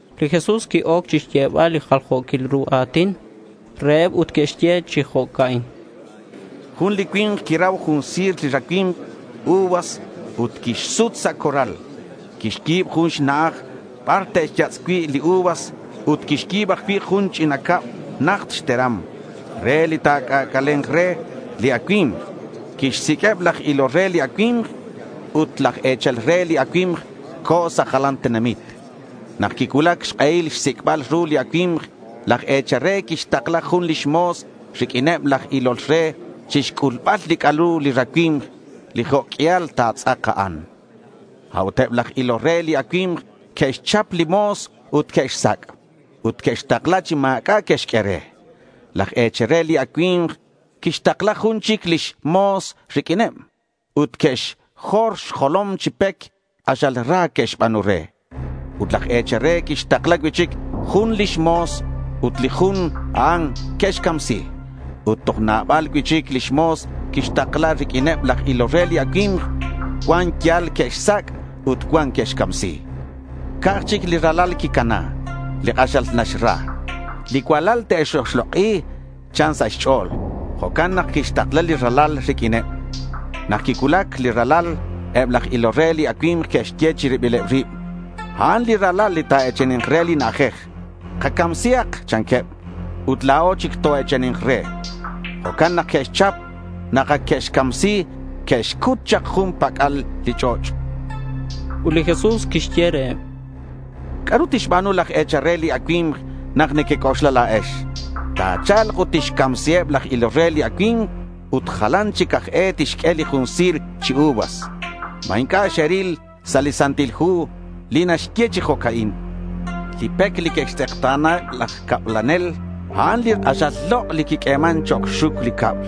Li Jesús qui-oc chixyebal li jaljo̱quil ru a̱tin reheb ut quixye chi jo'ca'in: Jun li cui̱nk quirau jun si̱r li racui̱mk uvas ut quixsut sa' corral. Quixyi̱b jun xna'aj bar te'xyatz' cui' li uvas ut quixyi̱b ajcui' jun ch'ina cab najt xteram re li ta̱c'ac'ale̱nk re li acui̱mk. Quixsiq'ueb laj ilol re li racui̱mk. Ut laj e̱chal re li acui̱mk co̱ sa' jalanil tenamit. Nak quicuulac xk'ehil xsic'bal ru li acui̱mk, laj e̱chal re quixtakla jun lix mo̱s riq'uineb laj ilol re chixc'ulbal li ru li racui̱mk li jo' q'uial ta̱tz'ak a'an. A'ut eb laj ilol re li acui̱mk que'xchap li mo̱s ut que'xsac'. Ut que'xtakla chi ma̱c'a' que'xq'ue re. Laj e̱chal re li acui̱mk quixtakla jun chic lix mo̱s riq'uineb. Ut que'xjor xjolom chi pec. K'axal ra que'xba̱nu re. Ut laj e̱chal re quixtakla cui'chic jun lix mo̱s ut li jun a'an que'xcamsi. Ut toj nabal cui'chic lix mo̱s quixtakla riq'uineb laj ilol re li racui̱mk. Cuan yal que'xsac' ut cuan que'xcamsi. Ca'aj chic li ralal quicana, li k'axal naxra. —Li cualal te'x-oxlok'i, chan sa' xch'o̱l. Jo'can nak quixtakla li ralal riq'uineb. Nak quicuulac li ralal, eb laj ilol re li acui̱mk que'xye chi ribileb rib, —A'an li ralal li ta̱e̱chani̱nk re li na'ajej. Kacamsihak, chanqueb, ut la̱o chic toe̱chani̱nk re.— Jo'can nak que'xchap. Nak ac que'xcamsi que'xcut chak jun pac'al li ch'och'. Ut li Jesús quixye reheb: —¿C'a'ru tixba̱nu laj e̱chal re li acui̱mk nak nequec'oxla la̱ex? Ta̱cha̱lk ut tixcamsiheb laj ilol re li racui̱mk, ut jalan chic aj e tixq'ue li jun si̱r chi uvas. ¿Ma inc'a' xeril sa' li Santil Hu li naxye chi jo'ca'in? Li pec li que'xtz'ekta̱na laj cablanel, a'an li k'axal lok' li quiq'ueman chok' xxuc li cab.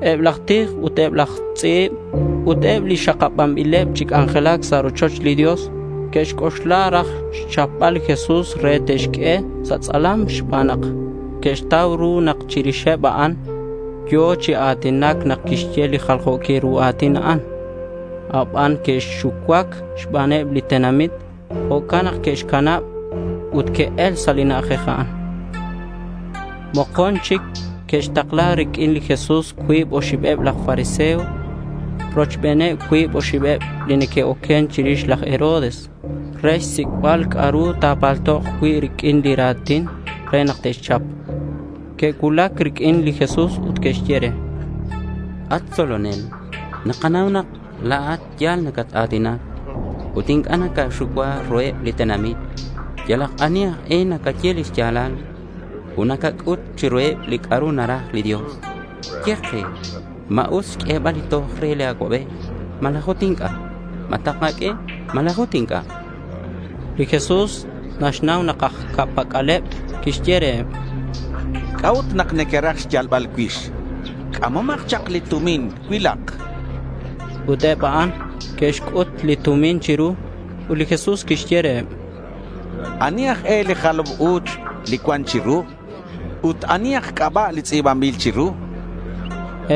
Eb laj tij ut eb laj tz'i̱b ut eb li xakabanbileb chi c'anjelac sa' rochoch li Dios que'xc'oxla raj xchapbal li Jesús re te'xq'ue sa' tz'alam xban nak que'xtau ru nak chirixeb a'an yo̱ chi a̱tinac nak quixye li jaljo̱quil ru a̱tin a'an. Abanan que'xucuac xbaneb li tenamit. Jo'can nak que'xcanab ut que'el sa' li na'ajej a'an. Mokon chic que'xtakla riq'uin li Jesús cuib oxibeb laj fariseo rochbeneb cuib oxibeb li neque'oquen chirix laj Herodes re xsic'bil c'a'ru ta̱paltok cui' riq'uin li ra̱tin re nak te'xchap. Que'cuulac riq'uin li Jesús ut que'xye re: —At tzolonel, nakanau nak la̱at ya̱l nacat-a̱tinac ut inc'a' nacaxucua ruheb li tenamit. Yalak ani aj e nacaye lix ya̱lal. Ut nacac'ut chiruheb li c'a'ru naraj li Dios. Ye ke, ¿ma us xq'uebal li toj re li acuabej malaj ut inc'a'? ¿Ma takaq'ue malaj ut inc'a'? chanqueb. Li Jesús naxnau nak aj ca'pac'aleb. Quixye reheb: —¿C'a'ut nak nequeraj xyalbal cuix? C'amomak chak li tumin. Cuilak, chan reheb. Ut eb a'an que'xc'ut li tumin chiru. Ut li Jesús quixye reheb: —¿Ani aj e li jalam u̱ch li cuan chiru? Ut ¿ani aj c'aba' li tz'i̱banbil chiru?—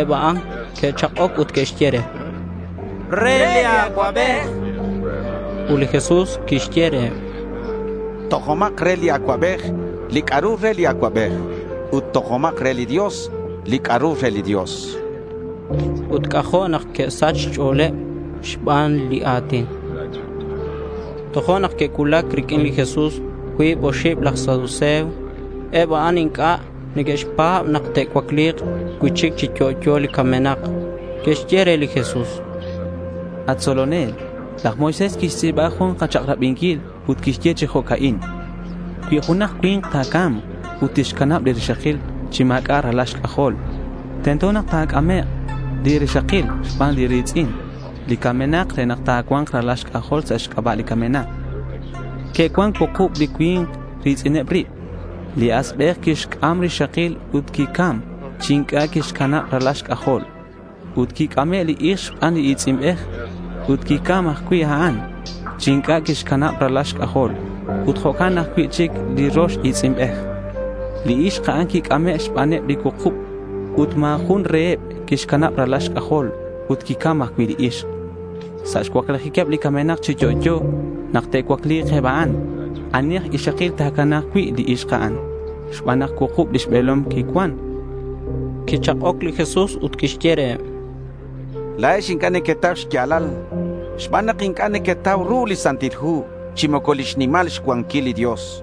Eb a'an que'chak'oc ut que'xye: —Re li acuabej, chanqueb. Ut li Jesús quixye reheb: —Tojomak re li acuabej li c'a'ru re li acuabej ut tojomak re li Dios li c'a'ru re li Dios, chan. Ut c'ajo' nak que'sach xch'o̱leb xban li ra̱tin. Tojo'nak que'cuulac riq'uin li Jesús cuib oxib laj saduceo. Eb a'an inc'a' neque'xpa̱b nak te'cuacli̱k cui'chic chi yo'yo li camenak. Que'xye re li Jesús: —At tzolonel, laj Moisés quixtz'i̱ba jun kachak'rabinquil ut quixye chi jo'ca'in: Cui junak cui̱nk ta̱ca̱mk ut tixcanab li rixakil chi ma̱c'a' ralal xc'ajol, tento nak ta̱c'amek' li rixakil xban li ri̱tz'in li camenak re nak ta̱cua̱nk ralal xc'ajol sa' xc'aba' li camenak. Que'cuan cuukub li cui̱nk ri̱tz'ineb rib. Li asbej quixc'am rixakil ut quicam chi inc'a' quixcanab ralal xc'ajol. Ut quic'ame' li ixk xban li i̱tz'inbej. Ut quicam ajcui' a'an chi inc'a' quixcanab ralal xc'ajol. Ut jo'can cui'chic li rox i̱tz'inbej. Li ixk a'an quic'ame' xbaneb li cuukub. Ut ma̱ jun reheb quixcanab ralal xc'ajol. Ut quicam ajcui' li ixk. Sa' xcuaclijiqueb li camenak chi yo'yo, nak te'cuacli̱k eb a'an, ¿ani aj ixakil ta̱cana̱k cui' li ixk a'an xban nak cuukub lix be̱lom quicuan? chanqueb. Quichak'oc li Jesús ut quixye reheb: —La̱ex inc'a' nequetau xya̱lal xban nak inc'a' nequetau ru li Santil Hu chi moco lix nimal xcuanquil li Dios.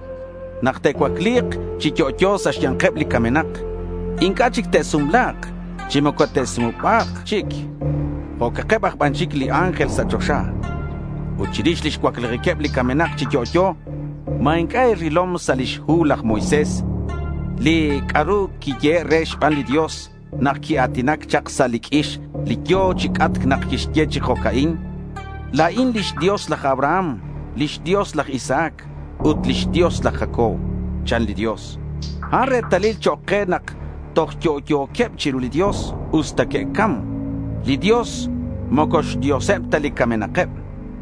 Nak te'cuacli̱k chi yo'yo sa' xya̱nkeb li camenak, inc'a' chic te'sumla̱k chi moco te'sumuba̱k chic. Jo'keb ban chic li ángel sa' choxa. Ut chirix lix cuaclijiqueb li camenak chi yo'yo, ¿ma inc'a' e̱rilom sa' lix hu laj Moisés li c'a'ru quiyehe' re xban li Dios nak quia̱tinac chak sa' li q'uix li yo̱ chi c'atc? Quixye chi jo'ca'in, “La̱in lix Dios laj Abraham, lix Dios laj Isaac ut lix Dios laj Jacob”, chan li Dios. A'an retalil chok' ke nak toj yo'yo̱queb chiru li Dios usta que'cam. Li Dios moco xDioseb ta li camenakeb;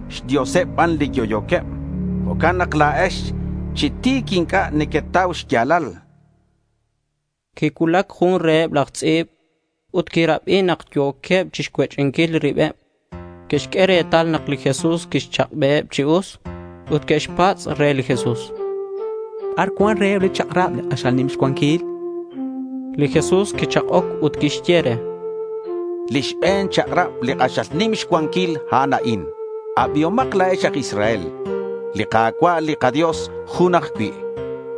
xDioseb ban li yo'yo̱queb. Jo'can nak la̱ex chi ti̱c inc'a' nequetau xya̱lal, chan li Jesús reheb. Quicuulac jun reheb laj tz'i̱b. Ut quirabi nak yo̱queb chixcuech'inquil ribeb. Quixq'ue retal nak li Jesús quixchak'beheb chi us, ut quixpatz' re li Jesús: —¿Bar cuan reheb li chak'rab li k'axal nim xcuanquil?— Li Jesús quichak'oc ut quixye re: —Li xbe̱n chak'rab, li k'axal nim xcuanquil, a'an a'in: Abihomak la̱ex aj Israel, li Ka̱cua' li kaDios jun ajcui'.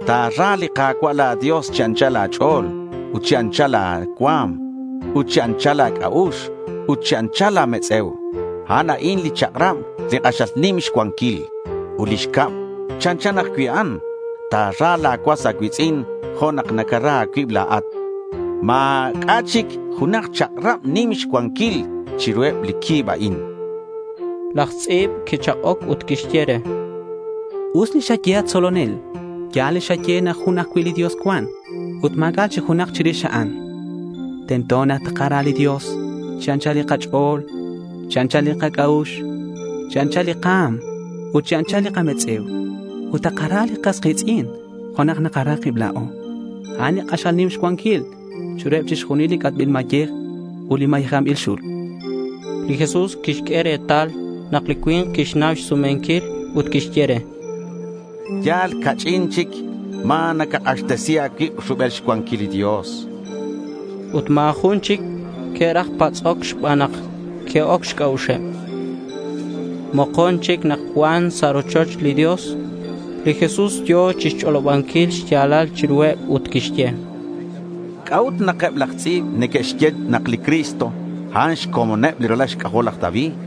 Ta̱ra li Ka̱cua' la̱ Dios chi anchal a̱ch'o̱l ut chi anchal la̱ cua̱m ut chi anchal la̱ c'a'ux ut chi anchal la̱ metz'e̱u. A'an a'in li chak'rab li k'axal nim xcuanquil. Ut li xcab chanchan ajcui' a'an: Ta̱ra la̱ cuas a̱cui̱tz'in jo' nak nacara a̱cuib la̱at. Ma̱c'a' chic junak chak'rab nim xcuanquil chiruheb li cuib a'in, chan. Laj tz'i̱b quichak'oc ut quixye re: —Us li xaye at tzolonel. Ya̱l li xaye nak jun ajcui' li Dios cuan ut ma̱c'a' chic junak chirix a'an. Tento nak takara li Dios chi anchal li kach'o̱l, chi anchal li kac'a'ux, chi anchal li ka̱m ut chi anchal li kametz'e̱u. Ut takara li kas ki̱tz'in jo' nak nakara kib la̱o. A'an k'axal nim xcuanquil chiruheb chixjunil li c'atbil mayej ut li mayejanbil xul, chan. Li Jesús quixq'ue retal nak li cui̱nk quixnau xsumenquil ut quixye re: —Yal ca'ch'in aj chic ma̱ nacak'axtesi a̱cuib rubel xcuanquil li Dios, chan. Ut ma̱ jun chic que'raj patz'oc xban nak qui-oc xc'a'uxeb. Mokon chic nak cuan sa' rochoch li Dios, li Jesús yo̱ chixch'olobanquil li xya̱lal chiruheb ut quixye: —¿C'a'ut nak eb laj tz'i̱b neque'xye nak li Cristo, a'an xcomoneb li ralal xc'ajol laj David?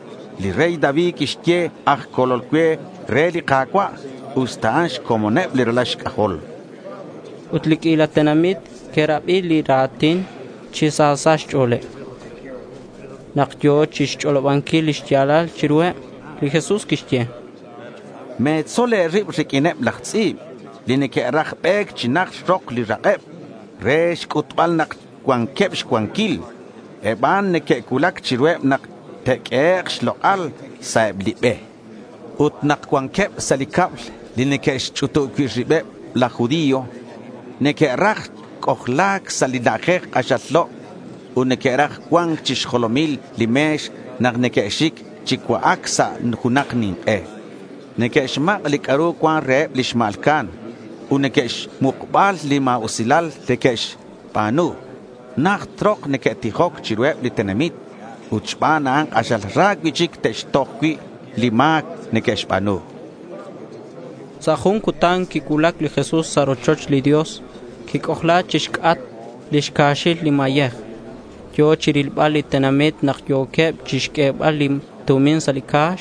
Li rey David quixye “aj Colol cue” re li Ka̱cua' usta a'an xcomoneb li ralal xc'ajol, chan li Jesús. Ut li q'uila tenamit que'rabi li ra̱tin chi sa sa' xch'o̱leb. Nak yo̱ chixch'olobanquil li xya̱lal chiruheb, li Jesús quixye: —Me̱tzol e̱rib riq'uineb laj tz'i̱b li neque'raj be̱c chi najt rok li rak'eb re xc'utbal nak cuanqueb xcuanquil. Eb a'an neque'cuulac chiruheb nak te'q'uehek' xlok'al sa' eb li be. Ut nak cuanqueb sa' li cab li neque'xch'utub cui' ribeb laj judío, neque'raj c'ojla̱c sa' li na'ajej k'axal lok' ut neque'raj cua̱nc chi xjolomil li me̱x nak neque'xic chi cua'ac sa' junak nink'e. Neque'xmak' li c'a'ru cuan reheb li xma̱lca'an ut re xmukbal li ma̱usilal neque'xba̱nu, najt rok neque'tijoc chiruheb li tenamit. Ut xban a'an k'axal ra cui'chic te'xtoj cui' li ma̱c neque'xba̱nu.— Sa' jun cutan quicuulac li Jesús sa' rochoch li Dios. Quic'ojla chixc'atk lix ca̱xil li mayej. Yo̱ chirilbal li tenamit nak yo̱queb chixq'uebal li tumin sa' li ca̱x.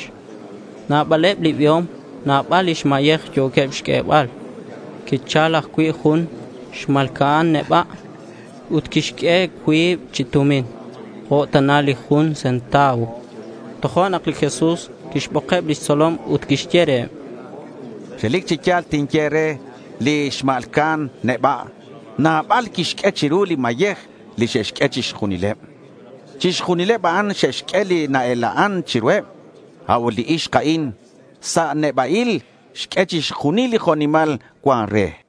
Nabaleb li biom nabal lix mayej yo̱queb chixq'uebal. Quichal ajcui' jun xma̱lca'an neba'. Ut quixq'ue cuib chi tumin jo' tana li jun centavo. Tojo'nak li Jesús quixbokeb lix tzolom ut quixye reheb: —Relic chi ya̱l tinye e̱re nak li xma̱lca'an neba' nabal xq'ue chiru li mayej li xe'xq'ue chixjunileb. Chixjunileb a'an xe'xq'ue li na-ela'an chiruheb. A'ut li ixk a'in sa' neba'il xq'ue chixjunil li jo' nimal cuan re.—